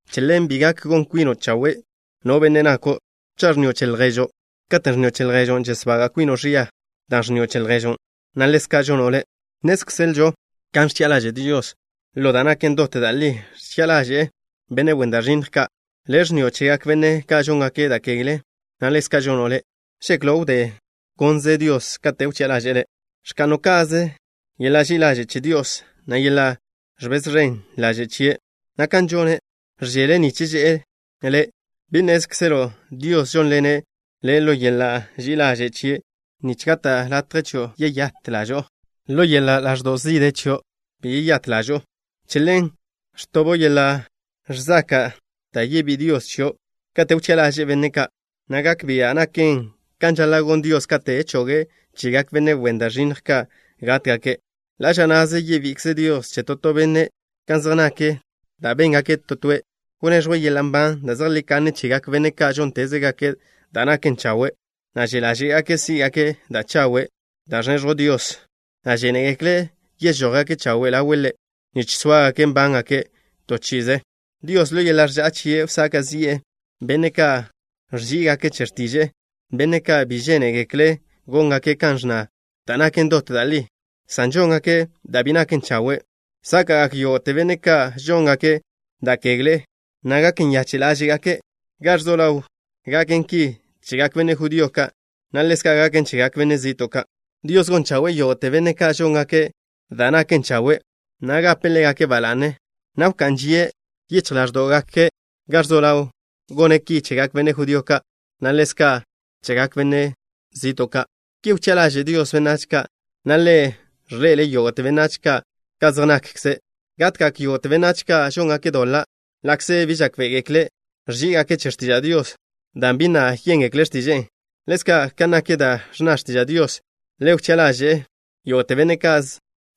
Che ḻen, bi gak gon kwino' chawe', no benne' nako', cha' ẕnnio' che lježo'. Katen' ẕnnio' che lježo', žesbaga' kwino' ẕia, dan' ẕnnio' che lježo', na' ḻezka' žono' le'. Nnézkzelžo kan ẕchi'a ḻaže' Dios. Ḻo da' naken dot da' li ẕchi'a ḻaže'e benne' wen da' ẕinnj ka'. Le' ẕnnio' chegak benne' ka' žóngake' da' kegle, na' ḻezka' žono' le'. ¿Žeklo' wdé gónzele Dios kate' wchi'a ḻaže'e le'? ¿Ẕka'no' ka'ze yeḻa' ži'i ḻaže' che Dios, na' yeḻa' ẕbez ẕen ḻaže' chie', na' kan žone', ẕžele' nich že'e le'? ¿Bi nnézkzelo' Dios žónḻene' le' ḻo yeḻa' ži'i ḻaže' chie' nich gata' chio' latje yeyát ḻažo'o? Ḻo yeḻa' ḻaẕdo' zižje chio' bi beyát ḻažo'o. Che ḻen ẕtobo' yeḻa' ẕzaka' da' yebí'i Dios chio' kate' wchi'a ḻaže'e benne' ka', na' gak bia' naken kan žaḻa' gon Dios kate' choge' chegak benne' wen da' ẕinnj ka' gátgake'. Ḻa' ža na'ze yebi'ikze Dios che to to benne' kan zej nak da' béngake' to toe'. Wneẕjwe' yeḻa' nban da' zejlí kanne chegak benne' ka' žóntezgake' da' naken chawe', na' že' ḻáže'gake' sí'gake' da' chawe' da' ẕneẕjw Dios, na' žénegekle' yežójgake' chawe' ḻawe' Ḻe', nich sóagake' nbángake' to chi'ize. Dios, ḻo yeḻa' ẕža'a chie', wsaka' zi'e benne' ka' ẕží'igake' che x̱tiže'e, benne' ka' bi žénegekle' góngake' kan ẕnna da' naken dot da' li, san žóngake' da' bi naken chawe'. Sáka'gak yógo'te benne' ka' žóngake' da' kegle, na' gak nyache' ḻáže'gake'. Ga ẕzo ḻaw gaken ki chegak benne' judío ka', na' ḻezka' gaken chegak benách zi'to' ka'. Dios gon chawe'e yógo'te benne' ka' žóngake' da' naken chawe', na' gape' ḻégake' ba la'ne, na' wká'n žie' yichj ḻáẕdo'gake'. Ga ẕzo ḻaw gone' ki chegak benne' judío ka', na' ḻezka' gone' chegak benách zi'to' ka'. Ki wchi'a ḻaže' Dios benách ka', na' Ḻe' ẕḻe'ele' yógo'te benách ka' ka zej nakkze'. Gatgak yógo'te benách ka' žóngake' doḻa', ḻa'kze bi žákbe'egekle' ẕží'igake' che x̱tiža' Dios dan' bi na' yéngekle' x̱tiže'e. Ḻezka', ka nak da' ẕnna x̱tiža' Dios, Ḻe' wchi'a ḻaže'e yógo'te benne' ka'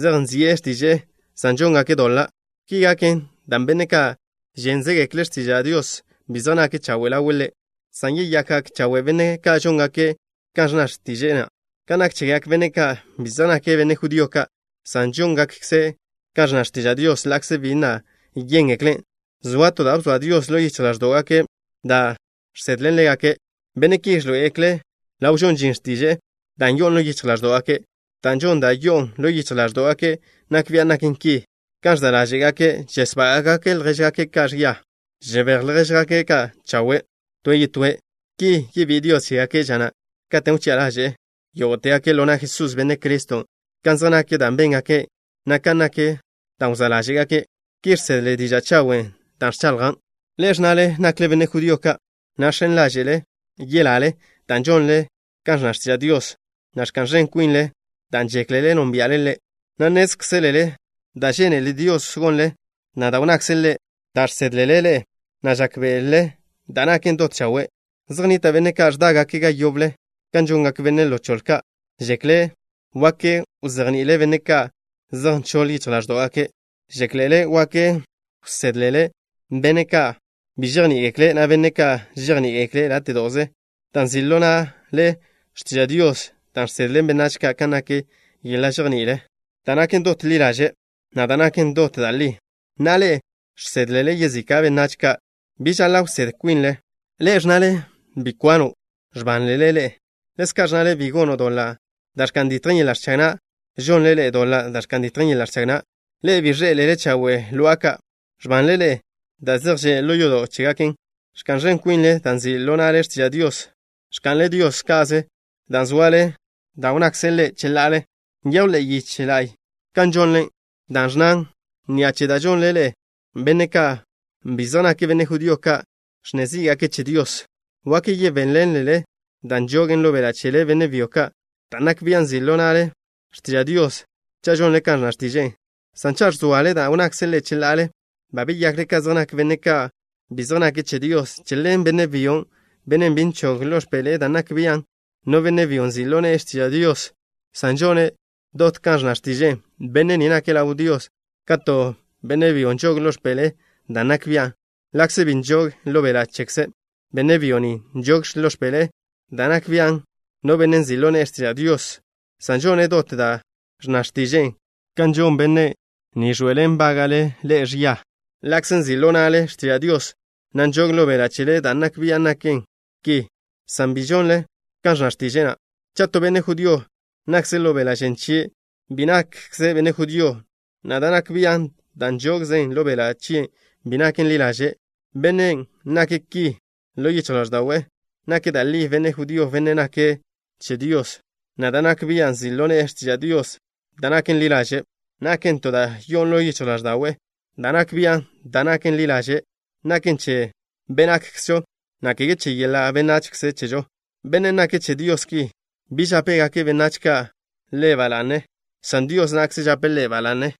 zej nzi'e x̱tiže'e, san žóngakkze' doḻa'. Ki gaken dan' benne' ka' žénzegekle' x̱tiža' Dios bi zej nake' chawe' ḻawe' Ḻe', san yeyakgak chawe' benne' ka' žóngake' kan ẕnna x̱tiže'e na'. Ka nak chegak benne' ka' bi zej nake' benne' judío ka', san žóngakkze' kan ẕnna x̱tiža' Dios ḻa'kze bi na' yéngeklen', zoa to da' bzoa Dios ḻo yichj ḻáẕdo'gake' da' žsedlen ḻégake'. Benne' ki ẕḻoé'egekle' ḻaw žon žin x̱tiže'e da' yo'on ḻo yichj ḻáẕdo'gake'. Da' žon da' yo'on ḻo yichj ḻáẕdo'gake' nak bian' naken ki. Kan ẕza' ḻáže'gake', žesbága'gake' ljéžgake' ka' ẕia, o žebéj ljéžgake' ka' chawe' toe' yetóe'. Ki yebí'i Dios chégake' ža na' katen' wchi'a ḻaže'e yógo'tegake' ḻo na' Jesús, Benne' Criston', kan zej nak da' béngake', na' kan nak da' wzá' ḻáže'gake'. Ki žsedle diža' chawen' da' ẕchaḻjan'. Ḻe'e ẕnnale nakle benne' judío ka', na' žx̱en ḻáže'le yelale dan' žonle kan ẕnna x̱tiža' Dios, na' ẕka'n ẕen kwinle dan' žéklele nónbia'le Ḻe', na' nnézkzelele da' žénele Dios gonle, na' da' wnnakze' Ḻe', da' žsédlele ḻe'e, na' žákbe'elele da' naken dot chawe'. Zej nnita' benne' ka' ẕdágake' ga yoble, kan žongak benne' ḻo choḻe ka'. Žéklele wak wzejní'ilele benne' ka' zej nchoḻ yichj ḻáẕdo'gake'. Žéklele wak wsédlele benne' ka' bi žejní'igekle', na' benne' ka' žejní'igekle' láte'do'ze, dan' nzi' ḻo na'le x̱tiža' Dios da' žsedlen benách ka' kan nak yeḻa' žejní'il da' naken dot ḻi ḻaže', na' da' naken dot da' li. Na'a, ḻe'e žsédlele yezika' benách ka'. ¿Bi žaḻa' wsédl kwinle? Ḻe'e ẕnnale: “Bi kwano'”. ¿Ẕbanle ḻe'e? Ḻezka' ẕnnale: “Bi gono' doḻa' da' ẕka'n ditjen yeḻa' ẕchag na'”. ¿Žonle ḻe'e doḻa' da' ẕka'n ditjen yeḻa' ẕchag na'? Ḻe'e bi ẕḻé'elele chawe' lo'a ka'. ¿Ẕbanle ḻe'e da' zej že' ḻo yodo' chégaken? Ẕka'n ẕen kwinle dan' nzi' ḻo na'le x̱tiža' Dios. ¿Ẕka'nle ḻe'e Dios ka'ze, dan' ẕzoale da' wnnakze' Ḻe' cheḻa'ale? Nyejw ḻe'e yiche la'y kan žonle, dan' ẕnnan: “Ni'a che da' žonle ḻe'e, benne' ka' bi zej nake' benne' judío ka' ẕnne zí'gake' che Dios.” Wak yebéḻenlele da' nžogen ḻo beḻa' chele, benne' byo ka', dan' nak bian' nzi' ḻo na'le x̱tiža' Dios, cha' žonle kan ẕnna x̱tiže'e, san cha' ẕzoale da' wnnakze' Ḻe' cheḻa'ale, ba beyakle ka zej nak benne' ka' bi zej nake' che Dios. Che ḻen, benne' byon', benne' bi nžog ḻo x̱peḻe'e dan' nak bian' no benne' byo nzi' ḻo ne'e x̱tiža' Dios, san žone' dot kan ẕnna x̱tiže'e, benne' ni nake' ḻaw Dios ka to benne' byo nžog ḻo x̱peḻe'e dan' nak bian', ḻa'kze bi nžogen ḻo beḻa' chekze'. Benne' byon' bi nžog ḻo x̱peḻe'e da' nak bian' no benne' nzi' ḻo ne'e x̱tiža' Dios, san žone' dot da' ẕnna x̱tiže'e, ka žon benne' ni ẕḻoe'elen nbága'le ḻe'e ẕia, ḻa'kze nzi' ḻo na'le x̱tiža' Dios, na' nžog ḻo beḻa' chele dan' nak bian' naken ki, san bi žonle kan ẕnna x̱tiže'e na'. Cha' to benne' judío nakzen' ḻo beḻa' žen chie', bi nakkze' benne' judío, na' da' nak bian' da' nžogzen ḻo beḻa' chie' bi naken ḻi ḻaže'. Bennen' nake' ki ḻo yichj ḻáẕda'we' nake' da' li benne' judío, benne' nake' che Dios, na' da' nak bia' nzi' ḻo ne'e x̱tiža' Dios da' naken ḻi ḻaže' naken to da' yo'on ḻo yichj ḻáẕda'we'. Da' nak bian' da' naken ḻi ḻaže' naken che be' nakkzžo, na' kege che yeḻa' benachze chežo. Bennen' nake' che Dios ki, bi žápegak benách ka' ḻe' ba la'ne, san Dios na'kze žape' ḻe' ba la'ne.